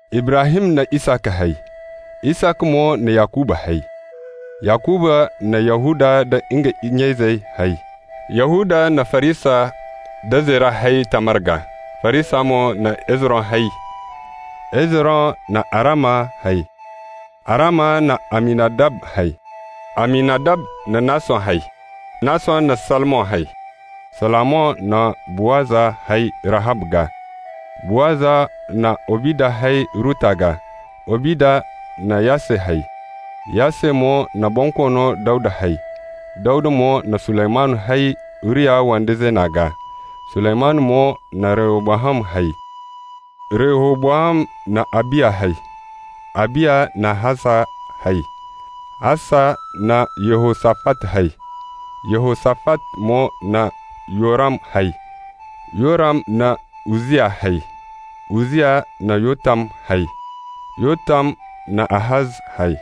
Ibrahim na Isaka hay, Isaka mo na Yakuba hay, Yakuba na Yahuda nda nga nya-izey hay, Yahuda na Farisa nda Zera hay Tamar gaa, Farisa mo na Hezron hay, Hezron na Arama hay, Arama na Aminadab hay, Aminadab na Nason hay, Nason na Salmon hay, Salmon na Buwaza hay Rahab gaa, Buwaza na Obida hay Ruta gaa, Obida na Yasse hay, Yasse mo na Bonkoono Dawda hay. Dawda mo na Suleymanu hay Uriya wande zeena gaa, Suleymanu mo na Rehobowam hay, Rehobowam na Abiya hay, Abiya na Asa hay, Asa na Yehosafat hay, Yehosafat mo na Yoram hay, Yoram na Uzziya hay, Uzziya na Yotam hay, Yotam na Ahaz hay,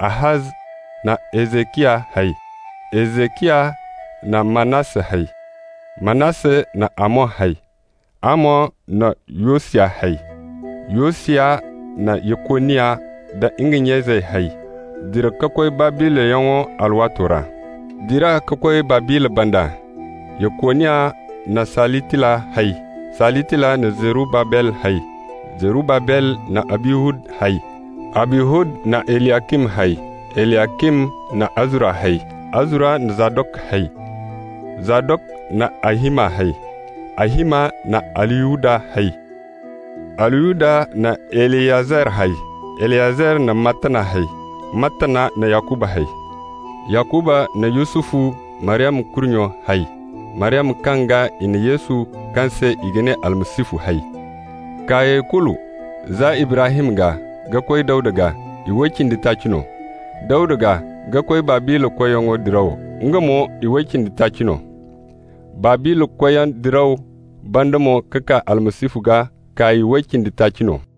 Ahaz na Hezeciya hay, Hezeciya na Manasse hay, Manasse na Amon hay, Amon na Yosiya hay, Yosiya na Yekoniya nda nga nya-izey hay dira ka koy Babila yaŋo alwaato ra. Dira ka koy Babila banda, Yekoniya na Salitila hay, Salitila na Zerubabel hay, Zerubabel na Abihud hay, Abihud na Eliyacim hay, Eliyacim na Azura hay, Azura na Zadok hay, Zadok na Ahima hay, Ahima na Aliyuda hay, Aliyuda na Eliyezar hay, Eliyezar na Mattana hay, Mattana na Yakuba hay, Yakuba na Yusufu, Maryama kurnyo, hay, Maryama kaŋ gaa i na Yesu, kaŋ se i ga ne Almasihu, hay. Kaayey kulu za Ibrahim gaa ka koy Dawda gaa, iway cindi taaci no. Dawda gaa ka koy Babila koyyaŋ diraw, nga mo iway cindi taaci no. Babila koyyaŋ diraw banda mo ka kaa Almasihu gaa, kaay way cindi taaci no.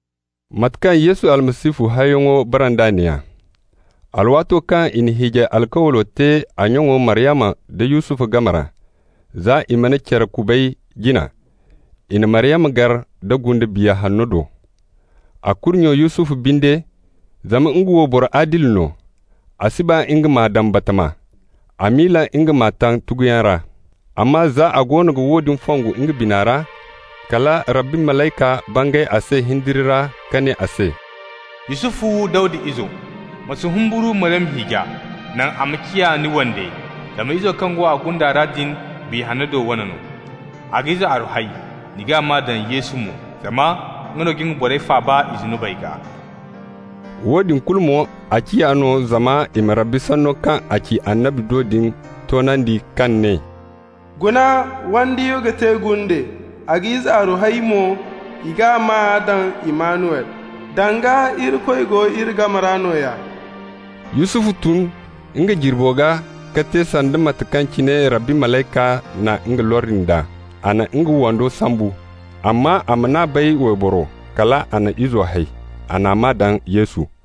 Mate kaŋ Yesu Almasihu hayyaŋo bara nd'a neeya: alwaato kaŋ i na hiijay alkawlo te a nyaŋo Maryama nda Yusufu game ra, za i mana care kubay jina, i na Maryama gar da gunde Biya Hanna do. A kurnyo Yusufu binde, zama nga wo boro adili no, a si ba nga m'a daŋ batama, a miila nga m'a taŋ tuguyaŋ ra. Amma za a goono ga woodin fongu nga bina ra, kal Rabbi malayka bangay a se hindiri ra ka ne a se: «Yusufu, Dawda izo, ma si humburu Maryama hiija, naŋ a ma ciya ni wande, zama izo kaŋ go a gunda ra din, Biya Hanno do wane no. A ga ize aru hay, ni g'a maa daŋ Yesu mo, zama nga no ga nga borey faaba i zunubey gaa.» Woodin kulu mo, a ciya no zama i ma Rabbi sanno kaŋ a ci annabi do din toonandi kaŋ ne: «Guna, wandiyo ga te gunde, a ga ize aru hay mo, i g'a maa daŋ Immanuwel,» (danga, Irikoy go iri game ra nooya.) Yusufu tun nga jirbo gaa ka te sanda mate kaŋ cine Rabbi malayka na nga lordi nd'a. A na nga wando sambu. Amma a man'a bay wayboro, kal a na izo hay. A n'a maa daŋ Yesu.